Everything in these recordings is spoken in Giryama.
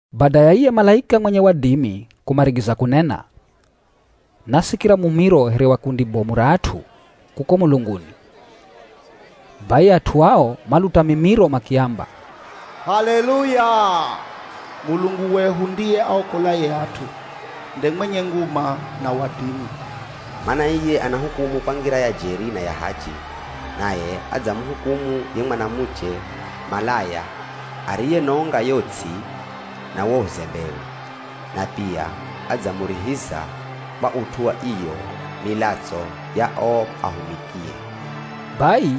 Bada ya iye malaika mwenye wadimi kumarigiza kunena, nasikira mumiro here wa kundi bomu ra at'u kuko mulunguni. Bai at'u ao maluta mimiro makiamba, “H'aleluya! Mulungu wehu ndiye aokolaye at'u, nde mwenye nguma, na wadimi. Mana iye anahukumu kwa ngira ya jeri na ya hachi. Naye adzamuhukumu ye mwanamuche malaya, ariyenonga yo ts'i na uwo uzembewe. Na pia adzamurihiza kwa ut'u wa iyo milatso ya o ahumikie.” Bai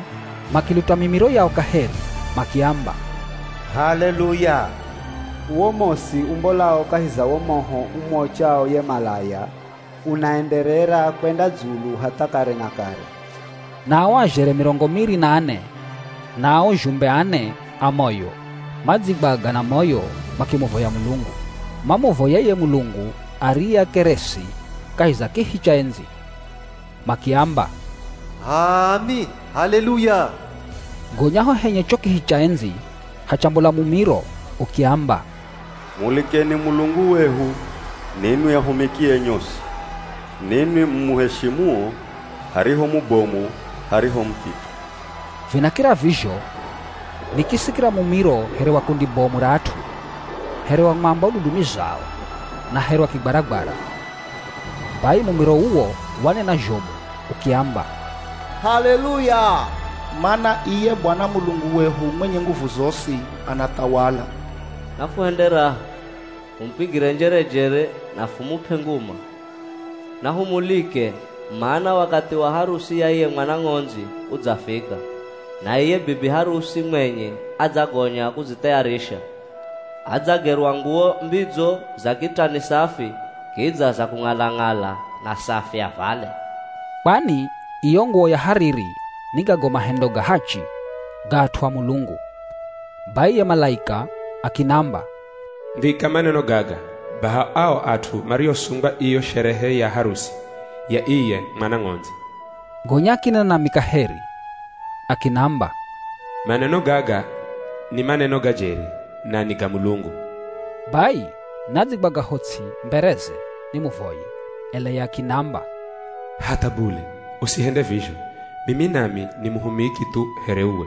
makiluta mimiro yao kaheri makiamba, “H'aleluya! Uwo mosi umbolao kahi za wo moho umuochao ye malaya unaenderera kwenda dzulu hatha kare na kare.” Na o azhere mirongo miri na ane na ao zhumbe ane a moyo, madzigwaga na moyo makimuvoya Mulungu. Mamuvoya iye Mulungu ariye akeresi kahi za kihi cha endzi, makiamba, “H'aami. H'aleluya!” Gonya ho henye cho kihi cha endzi hachambola mumiro ukiamba, “Mulikeni Mulungu wehu ninwi ahumikie nyosi, ninwi mumuheshimuo, hariho mubomu hariho muthithe.” Vinakira vizho, nikisikira mumiro here wa kundi bomu ra at'u, here wa mwamba ududumizao na here wa kigwaragwara. Bai mumiro uwo wanena zhomu ukiamba, “H'aleluya! Mana iye Bwana Mulungu wehu mwenye nguvu zosi, anathawala. Nafuhende raha, fumupigire njerejere na fumup'e nguma. Nahumulike mana wakathi wa harusi ya iye Mwana Ng'ondzi udzafika, na iye bibi harusi mwenye adzagonya kudzithayarisha. Adzagerwa nguwo mbidzo za kitani safi, kidza za kung'ala-ng'ala na safi, avale.” Kwani iyo nguwo ya hariri ni gago mahendo ga hachi ga at'u a Mulungu. Bai ye malaika akinamba, “Ndhika maneno gaga: Baha ao at'u mariosungwa iyo sherehe ya harusi ya iye Mwana Ng'ondzi.” Gonya akinena nami kaheri akinamba, “Maneno gaga ni maneno ga jeri, na ni ga Mulungu.” Bai nadzigwaga ho ts'i mbereze nimuvoye, ela ye akiniamba, “Hatha bule, usihende vizho. Mimi nami ni muhumiki thu here uwe,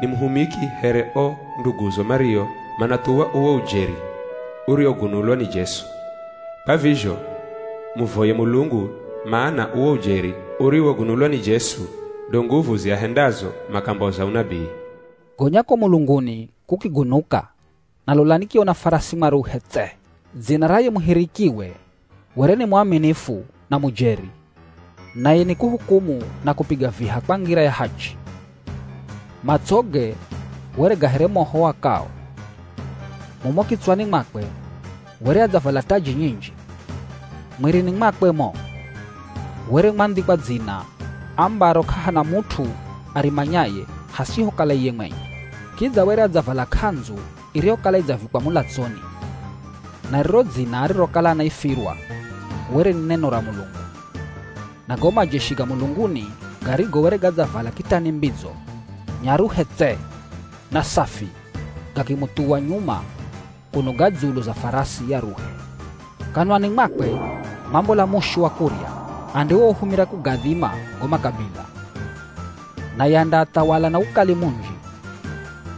ni muhumiki here o nduguzo mario manathuwa uwo ujeri uriwogunulwa ni Jesu. Kwa vizho muvoye Mulungu, mana uwo ujeri uriwogunulwa ni Jesu, ndo nguvu ziahendazo makamboza unabii.” Gonya ko mulunguni kukigunuka na lola nikiona farasi mwaruhe tse. Dzina ra ye muhirikiwe were ni Muaminifu na Mujeri. Naye nikuhukumu na kupiga viha kwa ngira ya hachi. Matsoge were ga here moho uakao. Mumo kitswani mwakwe were adzavala taji nyinji. Mwirini mwakwe mo, were mwandhikwa dzina ambaro k'ahana mut'u arimanyaye hasihokala iye mwenye. Kidza were adzavala k'andzu iriyokala idzavikwa mulatsoni. Na riro dzina arirokala anaifirwa were ni “Neno ra Mulungu.” Na go majeshi ga mulunguni garigo were gadzavala kitani mbidzo, nyaruhe tse, na safi, gakimuthuwa nyuma kuno ga dzulu za farasi aruhe. Kanwani mwakwe mwambola mushu wa kurya andiwouhumira kugadhima go makabila, naye andaathawala na ukali munji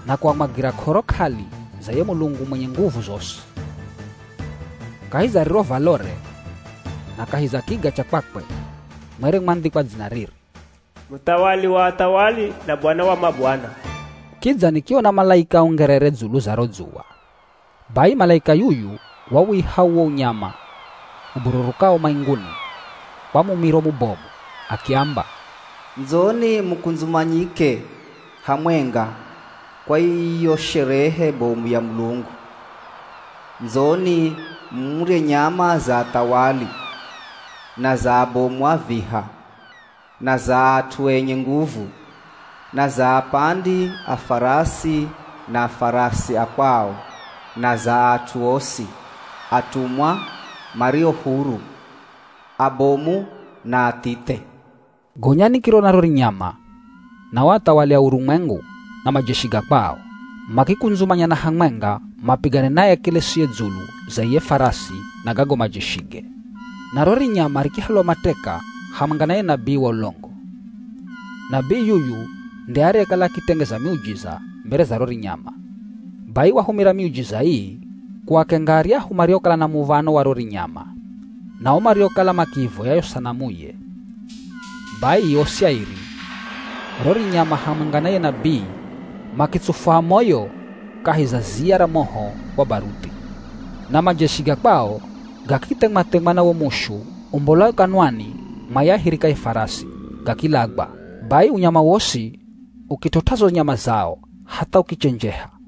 na kuamwagira k'oro k'ali za ye Mulungu mwenye nguvu zosi. Kahi za riro valore na kahi za kiga cha kwakwe mwere mwandhikwa dzina riri: “Muthawali wa athawali na Bwana wa mabwana.” Kidza nikiona malaika aungerere dzulu za ro dzuwa. Bai malaika yuyu wawiha uwo unyama ubururukao mainguni kwa mumiro mubomu, akiamba, “Ndzoni mukundzumanyike hamwenga kwa iyo sherehe bomu ya Mulungu. Ndzoni murye nyama za athawali, na za abomu a viha, na za at'u enye nguvu, na za apandi a farasi na farasi a kwao, na za at'u osi, atumwa, mario huru, abomu na athithe.” Gonya nikirona ro rinyama na o athawali a urumwengu na majeshi ga kwao. Makikundzumanyana hamwenga mapigane na ye akelesiye dzulu za iye farasi na gago majeshige. Na ro rinyama rikihalwa mateka hamwenga na ye nabii wa ulongo. Nabii yuyu nde ariyekala akitengeza miujiza mbere za ro rinyama. Bai wahumira miujiza ii kuakenga aryahu mariokala na muv̱ano wa ro rinyama na o mariokala makiivoya yo sanamuye. Bai osi airi, ro rinyama hamwenga na ye nabii makitsufwa a moyo kahi za ziya ra moho wa baruthi. Na majeshi ga kwao gakithemwa-themwa na wo mushu umbolao kanwani mwa ye ahirikaye farasi, gakilagwa. Bai unyama wosi ukit'ot'a zo nyama zao hatha ukichenjeha.